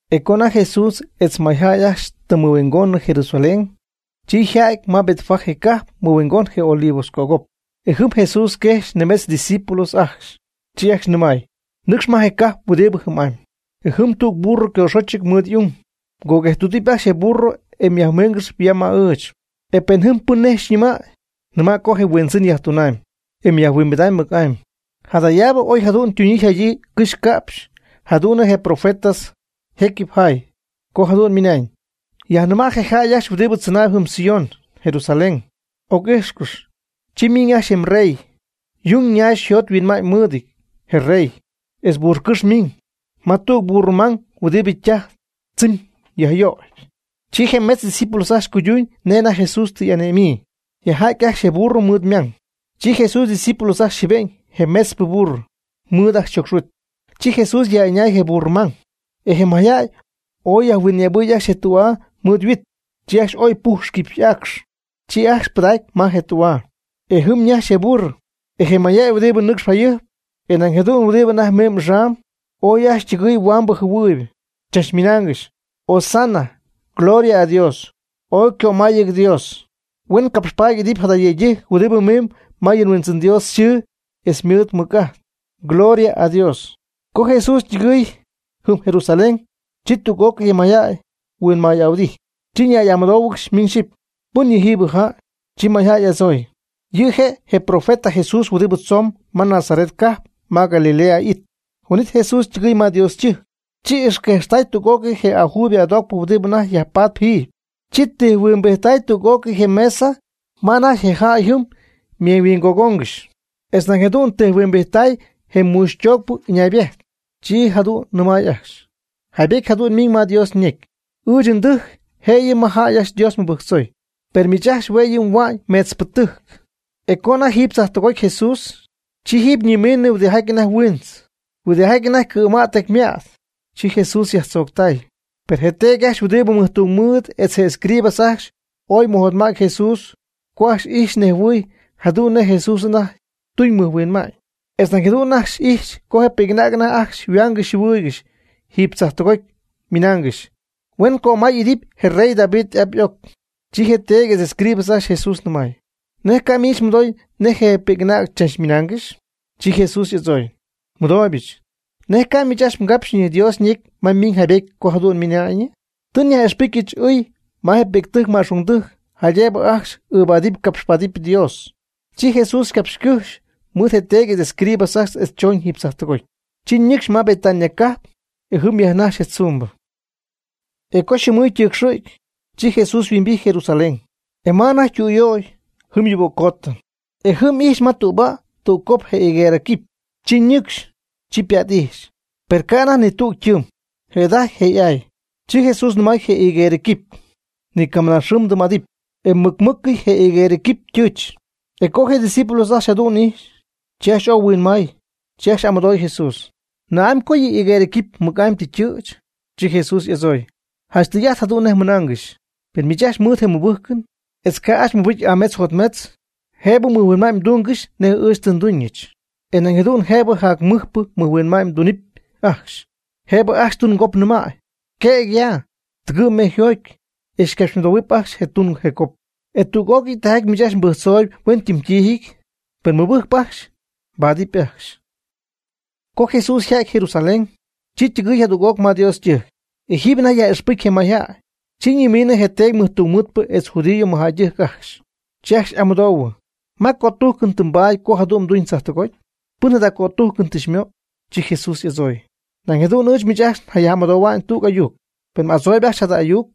E co anajty Jesús etz je mayjäy ajcxy tɨ mɨhuingonɨ Jerusalén, chi yja'ty ma Betfagé cajp mɨhuingon je Olivos cögop. E jɨm Jesús quejxy nimetz ydiscípulos ajcxy. Chi ajcxy nɨmay: ―Nɨcxcɨx ma je cajp huɨdibɨ jɨm'amy. E jɨm tüg burro ycoxochɨty mɨɨd y'ung. Coguejttüdɨp ajcxy je burro e yajmiingɨx ya ma ɨɨch. E pen jɨm pɨn nej xyñɨmäy, nɨma' co je Huindzɨn yajtunam, e yajhuimbida'ñ mɨc'amy. Jadayaabɨ oy jadu'n ytuñyii yjadyii ycɨxy yca'pxy jadu'n nej je profeta jecyɨp jaay, co jadu'n ymɨnañ: Yajnɨma' je jäy ajcxy huɨdibɨ tzɨnaayb jɨm Sión (Jerusalén), oc'ijxcɨx, chi miiñ ajcxy je mrey, yung nax yjot yhuinma'ñ mɨɨdɨty je mrey, etz burrocɨ́xy miiñ. Ma tüg burro mang huɨdibɨ ytaj tzɨmy yajyöyp. Chi je metz ydiscípulos ajcxy cuyduñ nej anajty Jesús tɨ y'ane'myii. Yajja'ty ajcxy je burro mɨɨd ymang. Chi Jesús ydiscípulos ajcxy jɨɨbe'ñ je metzpɨ burro mɨɨd ajcxy yjocxhuit, chi Jesús yaj'ɨñay je burro mang. E je mayjäy ooy yajhuinyëbɨy ajcxy je tü'aa mɨɨd yhuit, chi ajcxy oy ypuxy quipy y'aacx. Chi ajcxy pɨdacy ma je tü'aa. E jɨm ñajxy je burro, e je mayjäy huɨdibɨ nɨcxp jayɨjp, e nañ jadu'n huɨdibɨ anajty mimb axam, ooy ajcxy ytɨgɨɨy huambɨ jɨhuɨɨyb, chach mɨnaangɨxy: ―¡Hosana! ¡Gloria a Dios! ¡Ooy ycömayɨty Dios! Huen capxpaady idɨpy jada yëydɨjc huɨdibɨ mimb ma yɨ nHuindzɨn Dios yxɨɨ etz mɨɨd ymɨc'ajt. ¡Gloria a Dios! Co Jesús ytɨgɨɨy jɨm Jerusalén, chi tüg'ócɨy je mayjäy huinmay'ahuɨdijty, chi ñay'amɨdóohuɨgɨxy miñ xyɨpy: ―¿Pɨn yɨ' yɨjiibɨ jäy? Chi mayjäy y'adzooy: ―Yɨ' je' je profeta Jesús huɨdibɨ tzoon ma Nazaret cajp ma Galilea it. Huin'it Jesús ytɨgɨɨy ma Dios ytɨjc. Chi ixquejxtay tüg'ócɨy je ajuybɨ adoocpɨ huɨdibɨ anajty yajpatp jiiby. Chi tijhuimbijttay tüg'ócɨy je mesa ma anajty jäy jɨm ymeeñyhuingogongɨxy, etz nañ jadu'n tijhuimbijttay je muuxytoocpɨ ɨñaybejt. Chi jadu'n nɨmay ajcxy: ―Jaaybety jadu'n ymiiñ ma Dios ñecy: “Ɨɨch ndɨjc je' yɨ' ma jäy ajcxy Dios mɨbɨjctzoy”, per miich ajcxy hue' yɨ' mhua'ñ meetzpɨ tɨjc. E co anajty jiiby tzajptɨgoty Jesús, chi jiiby ñimiinɨ huɨdijaty anajty huintz, huɨdijaty anajty cɨ̈ma'ty tecyma'ty, chi Jesús yajtzooctay. Per je teedy ajcxy huɨdibɨ mɨjtungmɨɨd etz je escribas ajcxy ooy mɨjotma'ty Jesús co ajcxy ijxy nejhuɨɨy jadu'n nej Jesús anajty tuñ mɨjhuinma'ñ. Etz nañ jadu'n ajcxy ijxy co je pi'c'anäg anajty ajcxy yhuaangɨxy yjɨhuɨɨygɨxy jiiby tzajptɨgoty, ymɨnaangɨxy: “¡Huen cömay'idɨpy je rey David y'ap y'oc!” Chi je teedy etz escribas ajcxy Jesús nɨmay: ―¿Nej ca' miich mmɨdooy nej je pi'c'anäg chach mɨnaangɨxy? Chi Jesús y'adzooy: ―Nmɨdooybɨch. ¿Nej ca' miich ajcxy mgapxyñɨ Dios ñecy ma ymiiñ jaaybety co jadu'n ymɨna'ñyɨ?: Tɨ myaj'ixpɨcy ɨɨy ma je pi'ctɨjc ma'xungdɨjc jaydëbɨ ajcxy ɨɨbaadɨp capxpaadɨp Dios. Chi Jesús ycapxycɨ́jxy mɨɨd je teedy etz escribas ajcxy etz chooñ jiiby tzajtɨgoty. Chi ñɨcxy ma Betania cajp, e jɨm yajnajxy je tzumbɨ. E co yxɨɨmɨy ytɨɨcxɨ̈gy, chi Jesús yhuimbijty Jerusalén. E ma anajty tɨm ytüyöy, jɨm yuuböccootɨ. E jɨm ijxy ma tüba' tüg cop je higuerɨ quipy. Chi ninɨcxy. Chi pät'ijxy, per ca' anajty ni tüg ytɨɨm, jëda'ajty je' y'aay. Chi Jesús nɨmay je higuerɨ quipy: ―¡Ni ca mɨnaa xɨɨ mdɨɨm'adɨpy! E mɨc mɨ́cɨyɨ je higuerɨ quipy ytɨɨch. E co je' ydiscípulos ajcxy jadu'n ijxy, chi ajcxy ooy huinmay. Chi ajcxy y'amɨdooy Jesús: ―¿Na'amy co yɨ higuerɨ quipy mɨc'amy tɨ ytɨ̈ch? Chi Jesús y'adzooy: ―Janch tɨy'ajt jadu'n nej nnɨmaaygɨxy. Pen miich ajcxy mɨɨd je mɨbɨjcɨn, etz ca' ajcxy mmɨbɨcy aametz jotmetz, jëbɨ mɨjhuinma'n mdungɨxy nej ɨɨch tɨ nduñɨch. E nañ jadu'n jëbɨ jac mɨjpɨ mɨjhuinma'ñ mdunɨpy ajcxy. Jëbɨ ajcxy tun cop mnɨmäy: “Quëg ya, tɨgɨ' mejyjoty” e xycapxymɨdohuɨpy ajcxy je tun je cop. E tüg'ócɨy tijaty miich ajcxy mbɨjctzooyb huen ytɨmytijyɨty, pen mmɨbɨjcp ajcxy, mbaadɨp ajcxy. Co Jesús yja'ty Jerusalén, chi ytɨgɨɨy jadüg'oc ma Dios ytɨjc. E jiiby anajty yaj'ixpɨcy je mayjäy, chi ñimiinɨ je teedy mɨjtungmɨɨdpɨ etz judío mɨjjäydɨjc ajcxy. Chi ajcxy y'amɨdoohuɨ: ―¿Ma cötujcɨn tɨ mbaady co jadu'n mduñ tzajtɨgoty? ¿Pɨn jada cötujcɨn tɨ xymöy? Chi Jesús y'adzooy: ―Nañ jadu'n ɨɨch miich ajcxy nyaj'amɨdoohuamy tüg ayuc. Pen m'adzooyb ajcxy jada ayuc,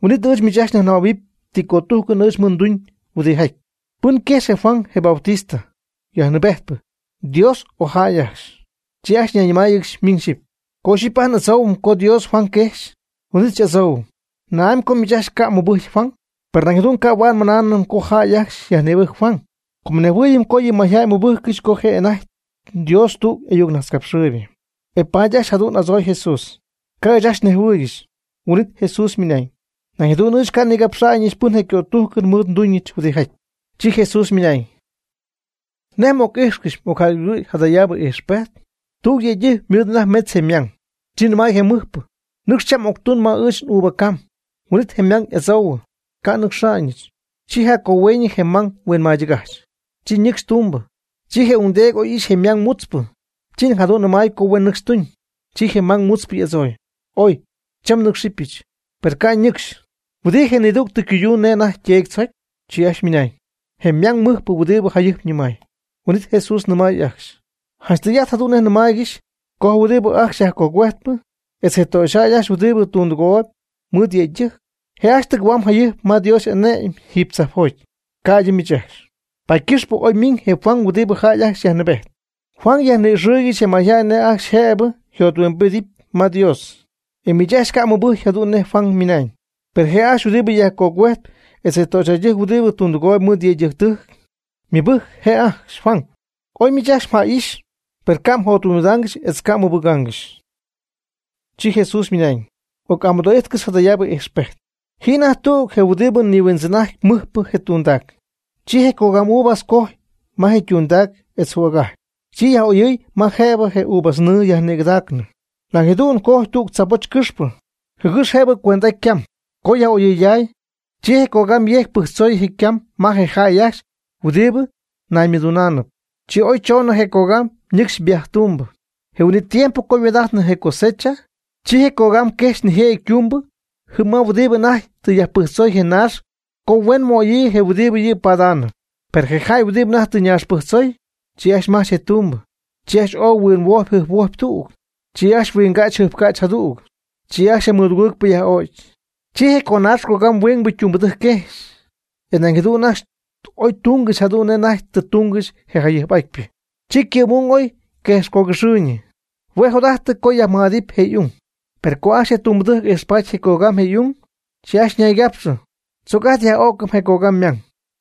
huin'it ɨɨch miich ajcxy nyajnɨmähuɨpy ti cötujcɨn ɨɨch mɨɨd nduñ huɨdijaty. ¿Pɨn quejxy je Juan, je Bautista, yajnɨɨbejtpɨ, Dios o jäy ajcxy? Chi ajcxy ñayñɨmáayɨgɨxy miñ xyipy: ―Co ixyipy ajt n'adzoohuɨm co Dios Juan quejx, huin'it xy'adzoohuɨm: “¿Na'amy co miich ajcxy ca' mmɨbɨjcy Juan?” Per nañ jadu'n ca' huaad nmɨnaanɨm co jäy ajcxy yajnïbɨjcy Juan, com nejhuɨɨyɨm co yɨ mayjäy mɨbɨjccɨxy co je' anajty Dios tüg y'ayucnajtzcapxɨɨybɨ. E paady ajcxy jadu'n adzooy Jesús: ―Ca' ɨɨch ajcxy nejhuɨɨygɨxy. Huin'it Jesús ymɨnañ: ―Nañ jadu'n ɨɨch ca' nigapxa'ñɨch pɨn je' ycötujcɨn mɨɨd nduñɨch huɨdijaty. Chi Jesús ymɨnañ: ―¿Nej m'oc'ixy m'ocjaygugɨ' jadayaabɨ ixpejt? Tüg je yëydɨjc ymɨɨd anajty metz je' ymang. Chi nɨmay je mɨjpɨ: “Nɨcx cham m'octuñ ma ɨɨch n'uva cam.” Huin'it je' ymang y'adzoohuɨ: “¡Ca' nnɨcxa'ñɨch!” Chi jaccohueeñyɨ je' ymang yhuinmaydɨgajch, chi ñɨcxy tumbɨ. Chi je ungdeedy oy ixy je ymang mutzpɨ. Chi nañ jadu'n nɨmaay co huen nɨcxy tuñ. Chi je' ymang mutzpɨ y'adzooy: “Oy, cham nɨ́cxɨbɨch.” Per ca' ñɨcxy. ¿Huɨdi je' nidügtɨ ycuyduuñ nej anajty yteedy tzocy? Chi ajcxy ymɨnañ: ―Je' ymang mɨjpɨ huɨdibɨ jayɨjp nɨmay. Huin'it Jesús nɨmay ajcxy: ―Janch tɨy'ajt jadu'n nej nɨmaaygɨxy co je huɨdibɨ ajcxy yajcogüejtpɨ etz je töxyjäy ajcxy huɨdibɨ tundɨgooyb mɨɨd yëydɨjc, je' ajcxy tɨgɨ̈huamb jayɨjp ma Dios y'ane'my jiiby tzajpjoty, ca'ydɨ miich ajcxy. Paady ycɨxpɨ oy ymiiñ je Juan huɨdibɨ jäy ajcxy yajnɨɨbejt, Juan yajni'ixɨɨygɨxy je mayjäy nej ajcxy jëbɨ yjothuimbidɨpy ma Dios. E miich ajcxy ca' mɨbɨjcy jadu'n nej Juan ymɨnañ. Per je' ajcxy huɨdibɨ yajcogüejtp etz je töxyjäydɨjc huɨdibɨ tundɨgooyb mɨɨd yëydɨjctɨjc, ymɨbɨjc je' ajcxy Juan. Oy miich ajcxy mja'ijxy, per ca' mjothuimbidaangɨxy etz ca' mɨbɨgaangɨxy. Chi Jesús ymɨnañ: ―Oc'amɨdoo'ijtcɨx jadayaabɨ ijxpejt. Ji anajty tüg je huɨdibɨ nihuindzɨn'ajtp mɨjpɨ je tundac. Chi je cogam uvas cojy ma je ytundac etz jügajy. Chi yaj'oyɨɨy ma anajty jëbɨ je uvas ñɨɨ yajnïgɨdägaanɨ. Nañ jadu'n cojy tüg tzaaboch cɨxpɨ, jɨgɨx jëbɨ cuend'aty ycam. Co yaj'oyɨyday, chi je cogam yejcy pɨjctzoy je ycam ma je jäy ajcxy huɨdibɨ naymɨdunaanɨp. Chi oy choonɨ je cogam nɨcxy viaje tumbɨ. Je huin'it tiempo co yhuaad'ajtnɨ je cosecha, chi je cogam quejxy nijëjɨty ytumbɨ jɨm ma huɨdibɨ anajty tɨ yajpɨjctzoy je ñaax co huen möyii je huɨdibɨ yɨ' paadaanɨp. Per je jäy huɨdibɨ anajty tɨ naax pɨjctzoy, chi ajcxy majch je tumbɨ. Chi ajcxy ooy huinhuojpy jɨjphuojpy tüg. Chi ajcxy huingäch jɨjpcäch jadüg. Chi ajcxy je mɨdugɨɨgpɨ yaj'o'cy. Chi je conaax cogam huingbɨ ytumbɨdɨjc quejxy. E nañ jadu'n ajcxy oy tungɨxy jadu'n nej anajty tɨ tungɨxy je jayɨjp'atypɨ. Chi ycɨ'm'ung oy quejx cogɨxɨɨyñɨ. Hue' jot'ajtɨ co yajmɨj'adɨɨyb je' y'ung. Per co ajcxy je tumbɨdɨjc ijxpaty je cogam je' y'ung, chi ajcxy ñaygapxɨ: “Tzoc ajt yaj'o'cɨm je cogam ymang,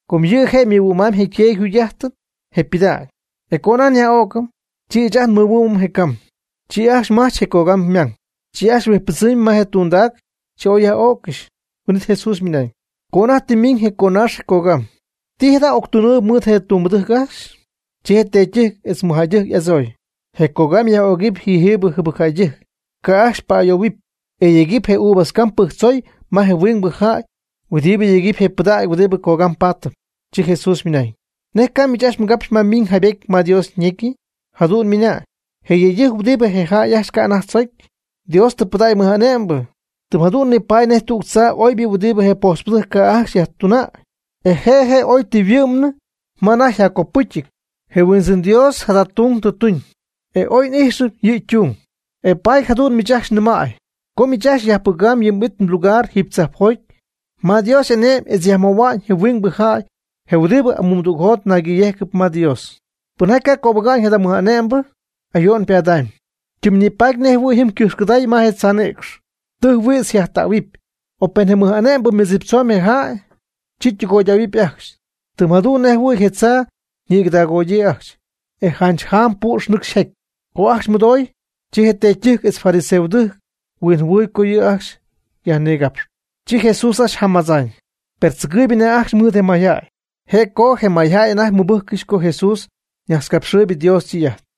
com yɨ' je' mɨhuɨ'mamb je' yteedy je yjugy'ajtɨn je ypɨdägy. E co ajt nyaj'o'cɨm, chi ɨɨch ajt nmɨhuɨ'mɨm je cam.” Chi ajcxy majch je cogam ymang. Chi ajcxy huijtzpɨdzɨmy ma je tundac. Chi oy yaj'öccɨxy. Huin'it Jesús ymɨnañ: ―Co anajty tɨ miiñ je conaax je cogam, ¿ti jada' y'octunɨpy mɨɨd je tumbɨdɨjc ajcxy? Chi je teedytɨjc etz mɨjjäydɨjc y'adzooy: ―Je cogam yaj'ögɨpy yɨjiibɨ jɨbɨcjäydɨjc, ca' ajcxy pa'ayoohuɨpy, etz yegɨpy je uvas cam pɨjctzoy ma je huingbɨ jäy huɨdibɨ yegɨpy je pɨdägy huɨdibɨ cogam paatɨp. Chi Jesús ymɨnañ: ―¿Nej ca'nɨ miich ajcxy mgapxy ma miiñ jaaybety ma Dios ñecyɨ? Jadu'n ymɨnañ: Je yëydɨjc huɨdibɨ je jäy ajcxy ca' anajty tzocy, Dios tɨ pɨdägy mɨj'ane'mbɨ. Tɨm jadu'n nipaady nej tüg tzaa oybɨ huɨdibɨ je pojtzpɨdɨjc ca' ajcxy yajtuna'ñ, e je' je' oy tɨ yhuɨ'mnɨ ma anajty yjaccopɨcyɨty. Je Huindzɨn Dios jada tung tɨ tuñ, e ooy oy n'ijxɨm yɨ' ytung. E paady jadu'n ɨɨch miich ajcxy nɨmäy co miich ajcxy myajpɨga'ñ yɨ m'it mlugar jiiby tzajpjoty ma Dios y'ane'my etz yajmöhua'ñ je huingbɨ jäy je huɨdibɨ amuumdügjot naygɨ̈yejcɨp ma Dios. Pɨnjaty ca' cöbɨga'ñ jada mɨj'ane'mbɨ, ayo'n ypadaamb, ytɨmnipatp nej jɨhuɨ̈y jɨm ycɨjxcɨday ma je tzaa nïcx, tɨjhuïdz yjajtähuɨpy. O pen je mɨj'ane'mbɨ mɨdziptzoñ je jäy, chi ytɨgoydähuɨpy ajcxy, tɨm jadu'n nej jɨhuɨ̈y je tzaa ñigɨdaagoodyii ajcxy, e janch jaam püx nɨcxy yjaty. Co ajcxy mɨdooy, chi je teedytɨjc etz je fariseostɨjc huinjɨhuɨɨy co yɨ' ajcxy yajnigapxyp, chi Jesús ajcxy jamadzaañ. Per tzɨgɨɨyb anajty ajcxy mɨɨd je mayjäy, je' co je mayjäy anajty mɨbɨjccɨxy co Jesús najtzcapxɨɨyb Dios ytɨy'ajt.